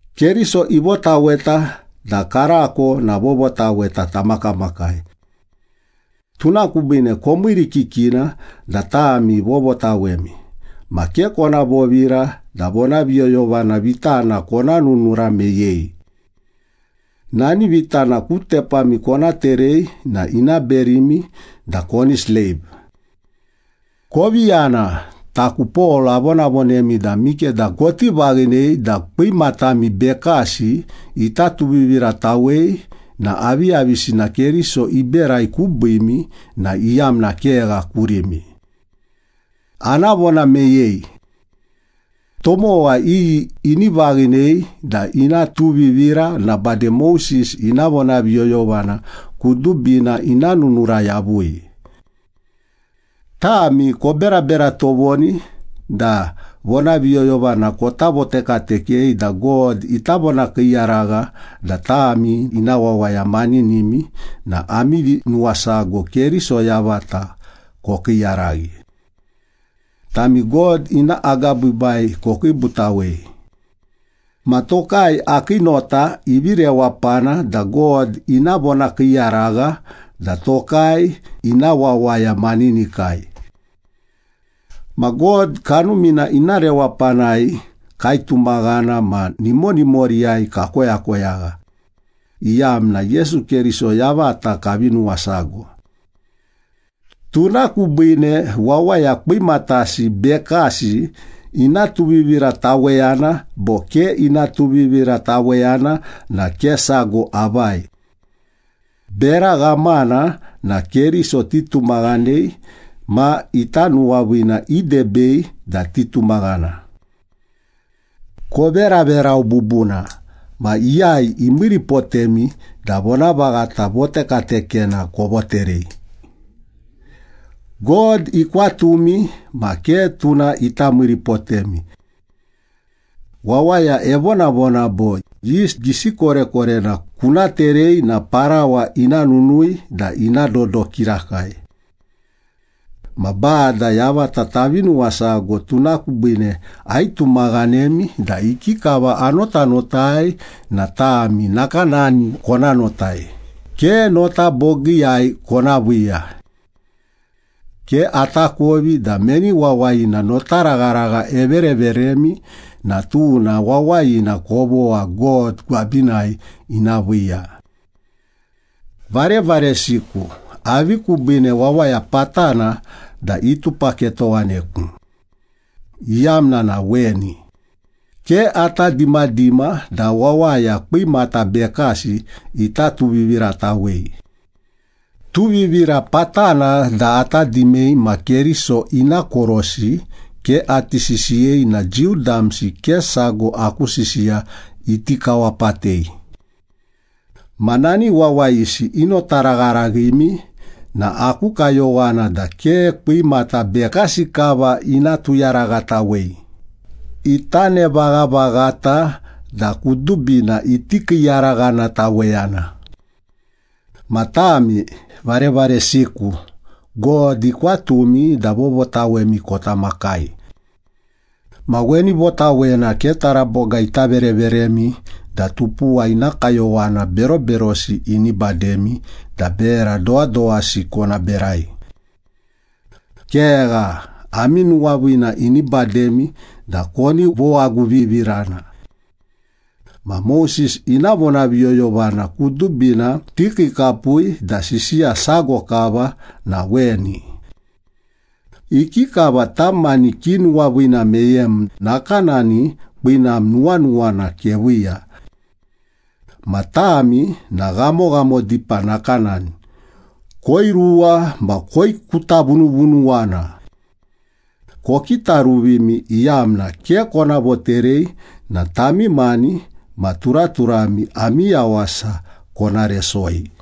Keriso ivotaweta da karako na vovotaweta tamakamakai. Tuna kubiine komiirikikina da tami vovotawemi, ma ke kona vovira da vonaviyoyovana vitana kona nunura meyei. Nani vitana ku tepami kona terei na ina berimi da koni sleiv. Kovi yana. Taku Pol avonavonemi da mikeda koti vaghinei da kwimatami bekasi ita tuviviratawei na aviyavisina Keriso iberai kubiimi na iyamna kegha kurimi. Ana vona meyei. Tomowa iyi ini vaghinei da ina tuvivira na bade Moses ina vonaviyoyovana kudubina ina nunura yavui. Tami koberabera tovoni da vonaviyoyovana kota votekatekei da God ita vonakiiyaragha da tami ina wawaya maninimi na ami vinuwasago Keriso yavata kokiiyaraghi. Tami God ina agabiibai kokiibutawei. Ma tokai, akii nota ivi rewapana da God ina vonakiiyaragha da tokai ina wawaya maninikai. Ma God Kanumina ina rewapanai kaitumaghana ma nimonimoriyai kakoyakoyagha, iyamna Yesu Keriso yavata kavi nuwasago. Tuna kubiine wawaya kwimatasi bekasi ina tuvivirataweyana bo ke ina tuvivirataweyana na ke sago avai. Bera ghamana na Keriso titumaghanei, ma ita nuwaviina idebei da titumaghana. Koveraverau bubuna, ma iyai imiiripotemi da vonavaghata votekatekena kovoterei? God ikwatumi, ma ke tuna ita miiripotemi. Wawaya evonavona bo, “Yist gisi korekorena kuna terei na parawa ina nunui da ina dodo kirakai.” Ma Bada yavata tavi nuwasago, tuna kubiine aitumaghanemi da ikikava anotanotai na tami nakanani kona notai, ke nota bogiiyai kona viiya. Ke atakovi da meni wawayina notaragharagha evereveremi na tuna wawayina kovogha God gwabinai ina viiya. Varevaresiku, avi kubiine wawaya patana da itupaketowaneku? Iyamna na weni. Ke ata dimadima da wawaya kwimata bekasi ita tuviviratawei. Tuvivira patana da ata dimei ma Keriso ina korosi ke ati sisiyei na Jiu damsi ke sago aku sisiya iti kawapatei. Ma nani wawayisi inotaragharaghimi na aku kayowana da ke kwimata bekasi kava ina tuyaraghatawei, ita nevaghavaghata da kudubina iti kiiyaraghanataweyana! Ma tami, varevaresiku, God ikwatumi da vovotawemi kota makai. Ma weni votawena ke taraboga ita vereveremi da tupuwa ina kayowana beroberosi ini bademi da bera dowadowasi kona berai. Kegha, ami nuwaviina ini bademi da koni vowaguvivirana. Ma Moses ina vonaviyoyovana kudubina tikiikapui da sisiya sago kava na weni. “Ikikava tam mani kinuwaviina meyem, nakanani kwinam nuwanuwana keviiya.” Ma tami na ghamoghamo dipa nakanani, koiruwa ma koikutavunuvunuwana. Kokitaruvimi, iyamna ke kona voterei na tami mani ma turaturami ami yawasa kona resoi.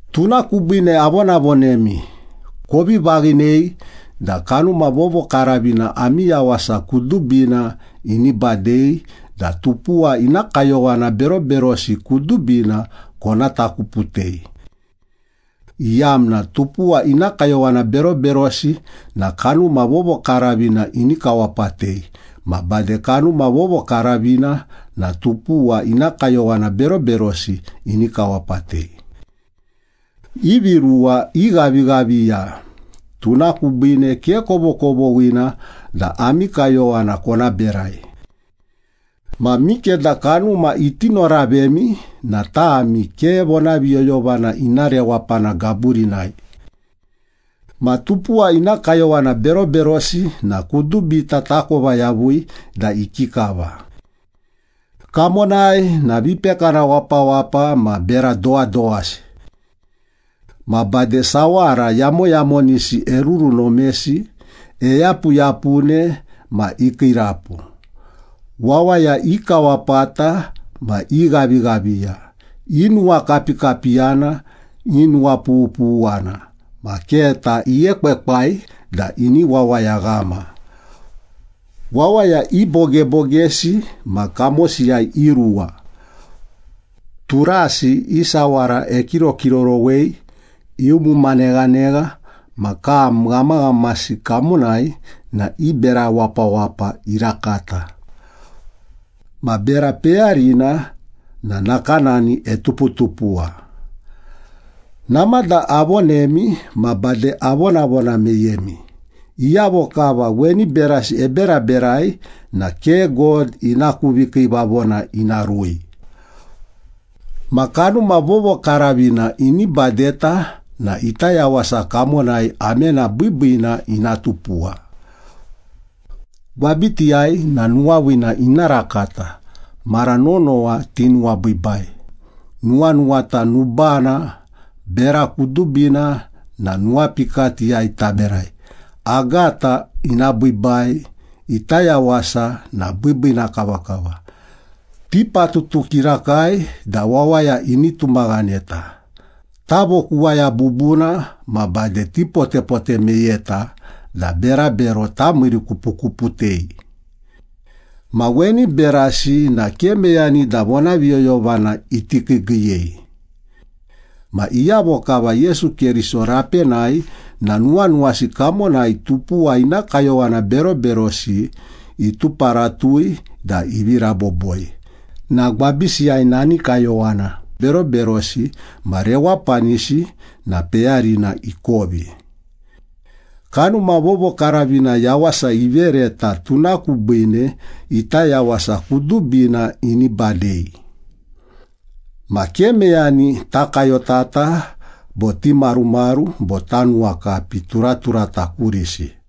Tuna kubiine avonavonemi, kovi vaghinei da Kanuma Vovokaravina ami yawasa kudubina ini badei da tupuwa ina kayowana beroberosi kudubina kona takuputei, iyamna tupuwa ina kayowana beroberosi na Kanuma Vovokaravina ini kawapatei, ma bade Kanuma Vovokaravina na tupuwa ina kayowana beroberosi ini kawapatei. Ivi ruwa ighavighaviya, tuna kubiine ke kovokovoghina da ami kayowana kona berai. Ma mikeda Kanuma iti noravemi na tami ke vonaviyoyovana ina rewapana gaburinai. Ma tupuwa ina kayowana beroberosi na kudubita takova yavui da ikikava. Kamonai na vipekana wapawapa ma bera dowadowasi. Ma bade sawara yamoyamonisi erurunomesi, eyapuyapune ma ikiirapu. Wawaya ikawapata ma ighavighaviya, inuwakapikapiyana, inuwapughuwana, ma keta iekwekwai da ini wawayaghama. Wawaya ibogebogesi ma kamosiyai iruwa. Turasi i sawara ekirokirorowei, iumuma neghanegha ma kam ghamaghamasi kamonai na i bera wapawapa irakata. Ma bera peyarina na nakanani etuputupuwa. Namada avonemi ma bade avonavona meyemi, iyavo kava weni berasi eberaberai na ke God ina ku vikiivavona ina rui. Ma Kanuma Vovokaravina ini badeta na ita yawasa kamonai amena biibiina ina tupuwa. Gwabitiyai na nuwaviina ina rakata, mara nonowa tinuwabiibai, nuwanuwata nubana, bera kudubina na nuwapikatiyai taberai, agata ina biibai, ita yawasa na biibiina kavakava, tipatutu kirakai da wawaya ini tumaghaneta, tavokuwaya bubuna ma bade tipotepote meyeta da berabero tamiirikupukuputei. Ma weni berasi na ke meyani da vonaviyoyovana iti kiigiiyei. Ma iyavo kava Yesu Keriso rapenai na nuwanuwasi kamonai tupuwa ina kayowana beroberosi ituparatui da ivi raboboi na gwabisiyai nani kayowana beroberosi ma rewapanisi na peyarina ikovi. Kanuma Vovokaravina yawasa ivereta, tuna kubiine ita yawasa kudubina ini badei. Ma ke meyani takayotata bo timarumaru bo tanuwakapi turaturata kurisi.